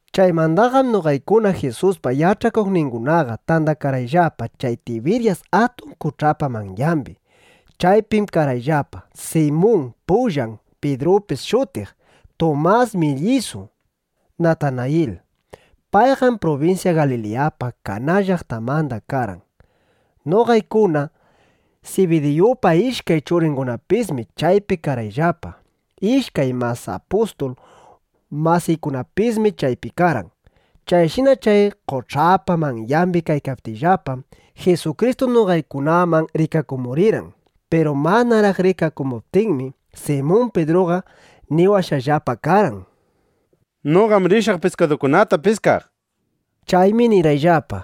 Chaymandaqam noqaykuna Jisuspa yach'akuqningunaqa tandakarqayllapa chay Tibiryas atun qoch'apa manyambi. [Nuta: Chay qoch'allam Galiliya qoch'a, Jinisarit qoch'apis shutin.] Chaypim karqayllapa: Simun; payllam Pidrupis shutiq; Tumas Millisu, Natanayil. Payqam prubinsya Galiliyapa Kaná llaqtanmanda karqan. Noqaykuna Sibidiyupa ishkay churingunapismi chaypi karqayllapa. Ishkay mas apustul masiykunapismi chaypi karqan. Chayshina chay qoch'apa manyambi kaykaptiyllapam, Jisukristu noqaykunaman rikakumurirqan. Piru manaraq rikakumuptinmi, Simun Pidruqa niwashqallapa karqan: —Noqam rishaq piskadukunata piskaq, nishpa. Chaymi nirqayllapa: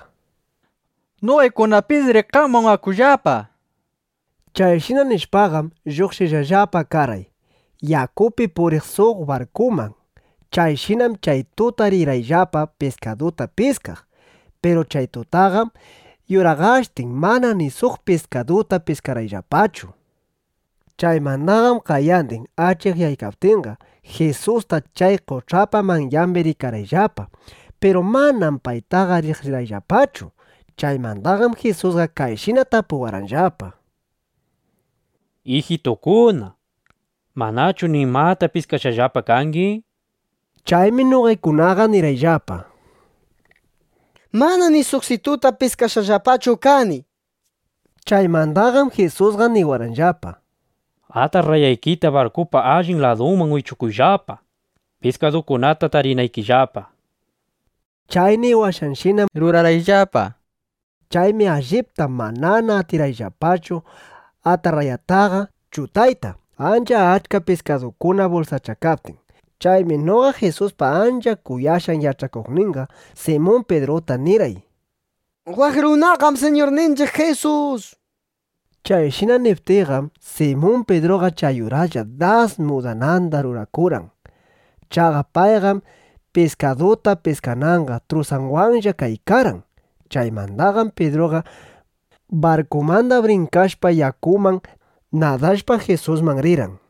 —Noqaykunapisri qamwan akullapa, nishpa. Chayshina nishpaqam, lluqshishqallapa karqay yakupi puriq suq barkuman. Chayshinam chay tuta rirqayllapa piskaduta piskaq. Piru chay tutaqam yuraqashtin mana ni suq piskaduta piskarqayllapachu. Chaymandaqam qayandin achikyaykaptinqa, Jisusta chay qoch'apa manyambi rikarqayllapa. Piru manam paytaqa riqsirqayllapachu. Chaymandaqam Jisusqa kayshina tapuwarqanllapa: —Ijitukuna, ¿manachu nimata piskashqallapa kangi? nishpa. Chaymi noqaykunaqa nirqayllapa: —Manam ni suqsituta piskashqallapachu kani, nishpa. Chaymandaqam Jisusqa niwarqanllapa: —Atarrayaykita barkupa allin ladunman wichukuyllapa, piskadukunata tarinaykillapa, nishpa. Chay niwashqanshinam rurarqayllapa. Chaymi allipta manana atirqayllapachu atarrayataqa chutayta, ancha achka piskadukuna bulsachakaptin. Chaymi noqa Jisuspa ancha kuyashqan yach'akuqninqa Simun Pidruta nirqay: —¡Waq runaqam Siñurninchiq Jisus! nishpa. Chayshina niptiyqam, Simun Pidruqa chay uraslla das mudananda rurakurqan. Chaqa payqam piskaduta piskananqa trusanwanlla kaykarqan. Chaymandaqam Pidruqa barkumanda brinkashpa yakuman, nadashpa Jisusman rirqan.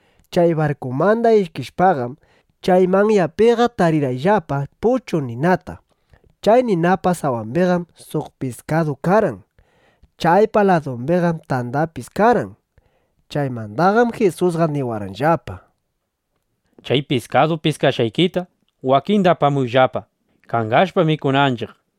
Chay barkumanda ishkishpaqam, chay manyapiqa tarirqayllapa puchu ninata. Chay ninapa sawambiqam suq piskadu karqan. Chaypa ladumbiqam tandapis karqan. Chaymandaqam Jisusqa niwarqanllapa: —Chay piskadu piskashqaykita wakinda apamuyllapa, (kangashpa, mikunanchiq) nishpa.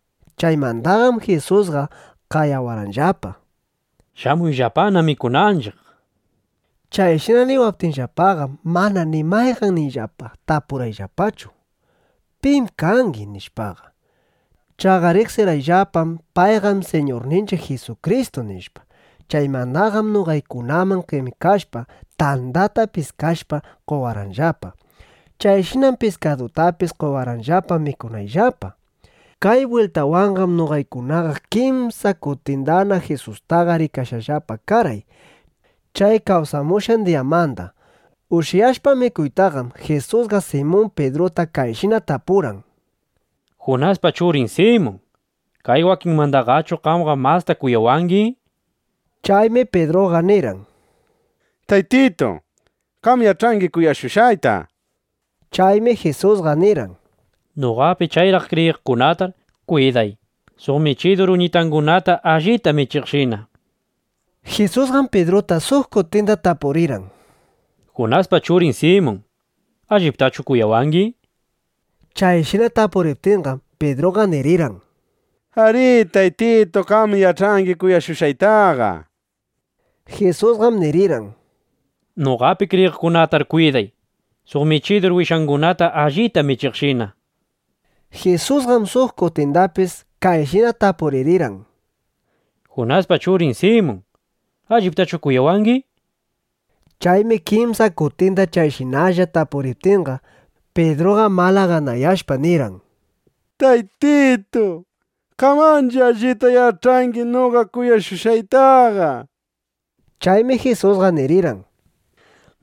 Chaymandaqam Jisusqa qayawarqanllapa: —Shamuyllapana mikunanchiq, nishpa. Chayshina niwaptinllapaqam, mana ni mayqanniyllapa tapurqayllapachu: “¿Pim kangi?” nishpaqa. Chaqa riqsirqayllapam: Payqam Siñurninchiq Jisukristu, nishpa. Chaymandaqam noqaykunaman qemikashpa, tandata piskashpa, qowarqanllapa. Chayshinam piskadutapis qowarqanllapa mikunayllapa. Kay bwiltawanqam noqaykunaqa kimsa kutindana Jisustaqa rikashqallapa karqay, chay kawsamushqan diyamanda. Ushyashpa mikuytaqam, Jisusqa Simun Pidruta kayshina tapurqan: —Junaspa churin Simun, ¿kay wakinmandaqachu qamqa masta kuyawangi? nishpa. Chaymi Pidruqa nirqan: —Taytitu, qam yach'angi kuyashushqayta, nishpa. Chaymi Jisusqa nirqan: —Noqapi chayraq kriyiqkunatar kwiday, suq michidur uñitangunata allita michiqshina, nishpa. Jisusqam Pidruta suq kutinda tapurirqan: —Junaspa churin Simun, ¿alliptachu kuyawangi? nishpa. Chayshina tapuriptinqam, Pidruqa nirirqan: —Arí, Taytitu, qam yach'angi kuyashushqaytaqa, nishpa. Jisusqam nirirqan: —Noqapi kriyiqkunatar kwiday, suq michidur wishangunata allita michiqshina, nishpa. Jisusqam suq kutindapis kayshina tapuririrqan: —Junaspa churin Simun, ¿alliptachu kuyawangi? nishpa. Chaymi kimsa kutinda chayshinalla tapuriptinqa, Pidruqa malaganayashpa, nirqan: —Taytitu, qam ancha allita yach'angi noqa kuyashushqaytaqa, nishpa. Chaymi Jisusqa nirirqan: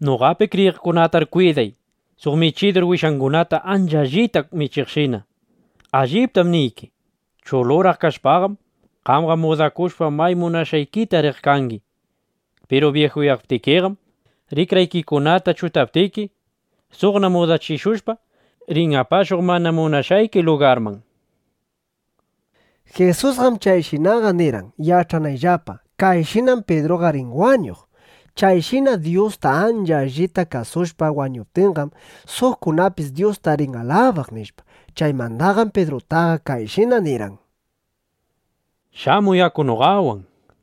—Noqapi kriyiqkunatar kwiday, suq michidur wishangunata ancha allita michiqshina. Alliptam niyki, chuluraq kashpaqam, qamqa mudakushpa, may munashqaykita riq kangi. Piru byijuyaptikiqam, rikraykikunata chutaptiki, suqna mudachishushpa, rin apashuq mana munashqayki lugarman, nishpa. Jisusqam chayshinaqa nirqan, yach'anayllapa: Kayshinam Pidruqa rin wañuq. Chayshina Dyusta ancha allita kasushpa wañuptinqam, suqkunapis Dyusta rin alabaq, nishpa. Chaymandaqam Pidrutaqa kayshina nirqan: —Shamuy, aku noqawan, nishpa.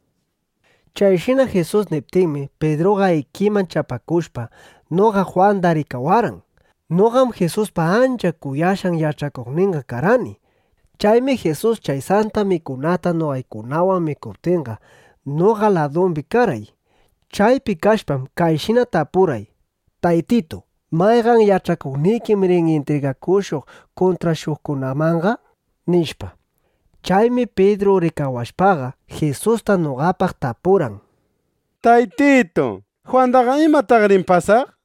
Chayshina Jisus niptinmi, Pidruqa ikiman chapakushpa, noqa Jwanda rikawarqan. Noqam Jisuspa ancha kuyashqan yach'akuqninqa karqani. Chaymi Jisus chay Santa Mikunata noqaykunawan mikuptinqa, noqa ladumbi karqay. Chaypi kashpam, kayshina tapurqay: “Taytitu, ¿mayqan yach'akuqnikim rin intrigakushuq kuntrashuqkunamanqa?” nishpa. Chaymi Pidru rikawashpaqa, Jisusta noqapaq tapurqan: —Taytitu, ¿Jwandaqa imataq rin pasaq? nishpa.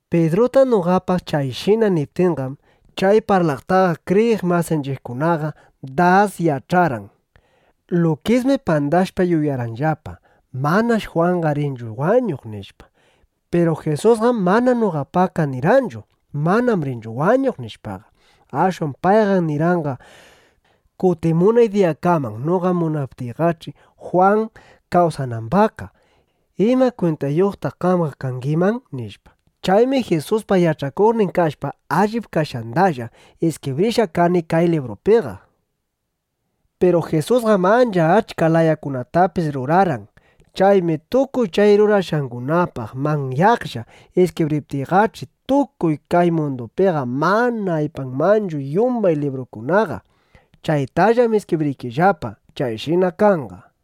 Pidruta noqapaq chayshina niptinqam, chay parlataqa kriyiq masinchiqkunaqa das yach'arqan. Lukismi pandashpa yuyarqanllapa: Manash Jwanqa rinchu wañuq, nishpa. Piru Jisusqam mana noqapaqqa nirqanchu: “Manam rinchu wañuq”, nishpaqa. Ashwan payqam nirqanqa: “Kutimunay diyakaman noqa munaptiyqach'i Jwan kawsanambaqqa, ¿ima kwintayuqtaq qamqa kangiman?” nishpa. Chaymi Jisuspa yach'akuqnin kashpa, allip kashqandalla iskibrishqa kani kay librupiqa. Piru Jisusqam ancha achka layakunatapis rurarqan. Chaymi tukuy chay rurashqangunapaq manyaqlla iskibriptiyqach'i, tukuy kay mundupiqa mana aypanmanchu yumbay librukunaqa. Chaytallam iskibriykillapa. Chayshina kanqa.